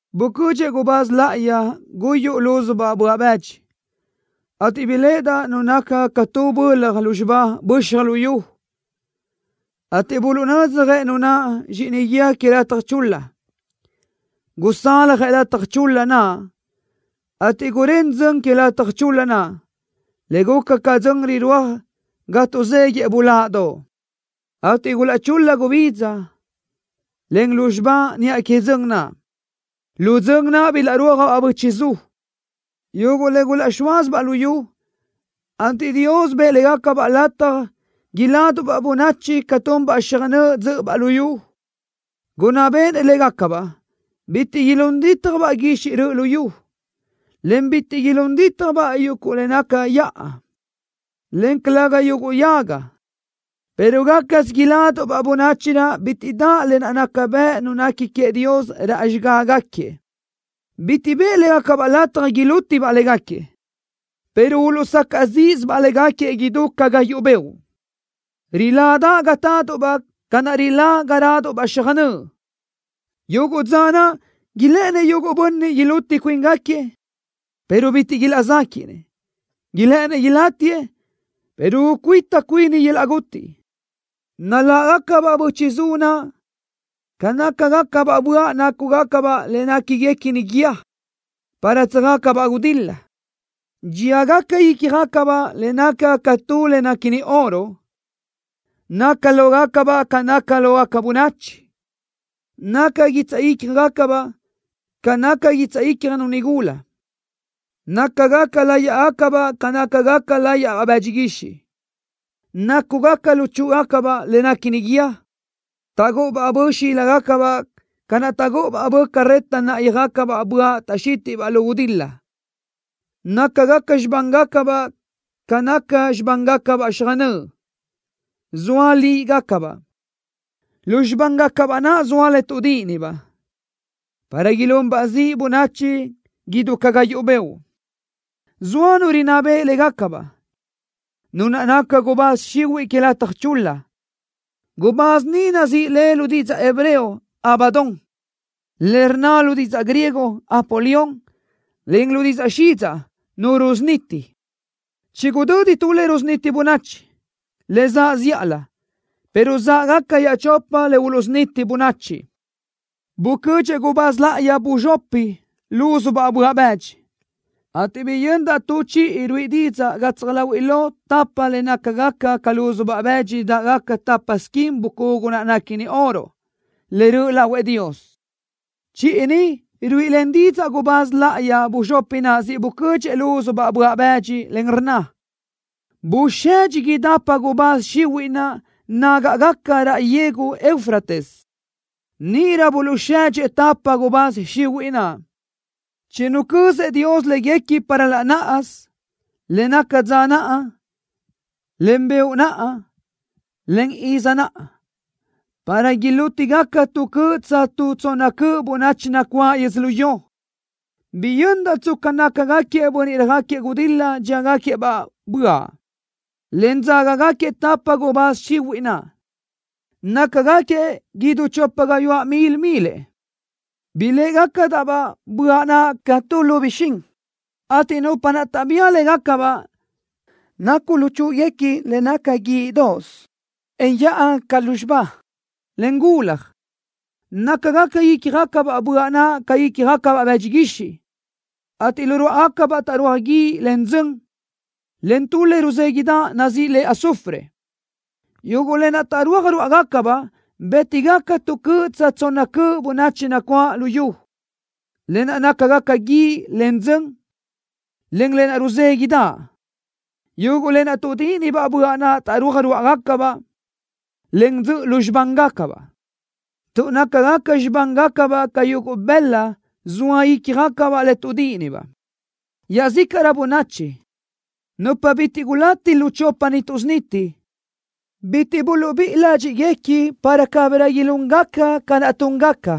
Bucödxëʼ gubáz láʼayi guyuʼ lúzubaʼ böaʼ bëdxi, ateʼ biléʼedaʼ nu naca ca tu bölaj lúzxiba böxaj luyú, ateʼ buluʼnödzjëʼ nu naʼ zxíʼini guíë que lataj chul-la. Gusaljëʼ lataj chul-la naʼ, ateʼ gurén dzön que lataj chul-la, le guca ca dzön rirúaj ga tuʼzéguiʼë buláʼdoʼ, ateʼ gulaʼchul-la gubidza, en lúzxiba niʼa que dzön naʼ. Lu dzön naʼ bilaʼrúajbaʼ bö́chiʼzu, yuguʼ le gulaʼzxóasibaʼ luyú, ateʼ Dios bëʼë légacabaʼ lataj iláduʼbaʼ bönachi ca tunbaʼ xöjnö́ʼ dzö́ʼöbaʼ luyú. Gunná béʼenëʼ légacabaʼ bitiʼ ilún dítjabaʼ guixiʼ röʼö luyú, en bitiʼ ilún dítjabaʼ yuguʼ le naca yaʼa, en calëga yuguʼ yaga, pero gácasö iláduʼbaʼ bönachi naʼ bitiʼ daʼ lë naʼ naca bëʼ nu nequi queëʼ Dios raʼ xigágaquiëʼ. Bitiʼ bëʼë légacabaʼ lataj ilútibaʼ légaquiëʼ, pero uluʼsacaʼ zíʼisibaʼ légaquiëʼ idú ca gayuʼ beoʼ. Riládaʼ ga táduʼbaʼ ca naʼ rilá ga ráduʼbaʼ xöjnö́ʼ. Yuguʼ dza naʼ ilë́ʼënëʼ yuguʼ bönniʼ iluti cuíngaquiëʼ, pero bitiʼ ilaʼzéquiʼnëʼ. Ilë́ʼëninëʼ ilátiëʼ, pero ucuíta cuini yöl-laʼ guti. Naláʼgacabaʼ bö́chiʼzu naʼ ca nácagacabaʼ böaʼ nácugacabaʼ le néquiguequini guíë, para tsöjácabaʼ gudil-la. Dxíagaca ícjagacabaʼ le nácagaca ca tu le néquini oro. Naca lógacabaʼ ca naca lógaca bönachi. Naca guitsaʼ ícjagacabaʼ ca naca guitsaʼ ícjanu nigula. Nácagaca láyiʼgacabaʼ ca nácagaca láyiʼbaʼ bëdxi guixiʼ. Nácugaca luchúʼugacabaʼ le néquini guíë. Taʼgúʼu bö xíligacabaʼ ca naʼ taʼgúʼu bö carreta náʼayöjgacabaʼ böaʼ taʼxítiʼbaʼ lu gudil-la. Nácagaca xibángacabaʼ ca naca xibángacabaʼ xöjnö́ʼ, zoa líʼigacabaʼ. Lu xibángacabaʼ naʼ zoa le tuʼdíʼinibaʼ, para ilunbaʼ ziʼ bönachi idú ca gayuʼ beoʼ. Zoa nu rinná beʼe légacabaʼ, nu naʼ naca gubáz xihuiʼ que lataj chul-la. Gubáz ni nazíʼi le lu didzaʼ hebreo: Abadón, le rnna lu didzaʼ griego: Apolión, en lu didzaʼ xidzaʼ: Nu Rusuniti. Chigudödi tu le rusuniti bönachi, le zaʼ zíʼalö, pero záʼgaca iaʼchopa le uluʼsuniti bönachi. Bucödxëʼ gubáz láʼayi buzxopi lúzubaʼ böaʼ bëdxi, ateʼ biyöndaʼ tu chiʼi ruíʼi didzaʼ gatsaj láhuiʼlö tapa le nácagaca ca lúzubaʼ bëdxi dáʼgaca tapa squin bucugu naʼ néquini oro, le röʼ lahuëʼ Dios. Chiʼi ni ruíʼilen didzaʼ gubáz láʼayi buzxopi naʼ siʼ bucödxëʼ lúzubaʼ böaʼ bëdxi, en rnna: “Busedxi idápatëʼ gubáz xihuiʼ naʼ nágaʼgaca raʼ yegu Eufrates.” Níʼirö buluʼsedxëʼ tapa gubáz xihuiʼ naʼ, chinucözëʼ Dios léguequi para laʼ náʼasö, le naca dza naʼ, en beoʼ naʼ, en izi naʼ, para ilútigaca tu cöʼ tsa tu tsonna cöʼ bönachi nacuáʼ yödzölió. Biyöndaʼ tsca nácagaquiëʼ bönniʼ röjáquiëʼ gudil-la dxíagaquiëʼ-baʼ böaʼ, en dzágagaquiëʼ tapa gubáz xihuiʼ naʼ. Nácagaquiëʼ idú chopa gayuáʼ mil milëʼ. Biléʼegacadaʼ-baʼ böaʼ naʼ ca tu lu bixín, ateʼ nupa taʼbía légacabaʼ nacu luchúʼuguequi le naca guiʼdoʼos, en yaʼa ca lúzxiba, en gulaj. Nácagaca ícjagacabaʼ böaʼ naʼ ca ícjabaʼ bëdxi guixiʼ, ateʼ lu ruáʼagacabaʼ taʼrúaj guíʼ, en dzön, en tu le ruzéguiʼdaʼ, nazíʼi le azufre. Yuguʼ lë naʼ taʼrúaj ruáʼagacabaʼ bë́tigaca tu cöʼ tsa tu tsonna cöʼ bönachi nacuáʼ luyú, lë naʼ nácagaca guíʼ, en dzön, en lë naʼ ruzéguiʼdaʼ. Yuguʼ le tuʼdíʼinibaʼ böaʼ naʼ taʼrúaj ruáʼagacabaʼ, en dzöʼö lu xibángacabaʼ, tuʼ nácagaca xibángacabaʼ ca yuguʼ bëla zoa ícjagacabaʼ le tuʼdíʼinibaʼ. Iaʼzícaʼrö bönachi, nupa bitiʼ gulati lu chopa ni tuʼsuniti, bitiʼ buluʼbíʼi ládxiʼguequi para cabirö ilúngaca ca naʼ túngaca,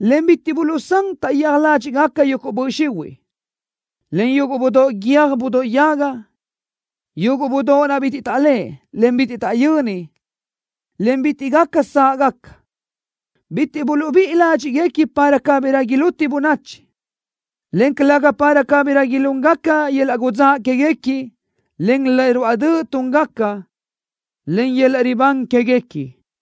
en bitiʼ buluʼsán taʼyéaj ládxiʼguequi yuguʼ böʼ xihuiʼ, en yuguʼ budóʼ guiö́j budóʼ yaga, yuguʼ budóʼ naʼ bitiʼ taʼléʼe, en bitiʼ taʼyöni, en bitiʼ gaca sáʼgaca. Bitiʼ buluʼbíʼi ládxiʼguequi para cabirö iluti bönachi, en calëga para cabirö ilúngaca yöl-laʼ gudzáʼ quéguequi, en le ruáʼ döʼ túngaca, en yöl-laʼ ribán quéguequi.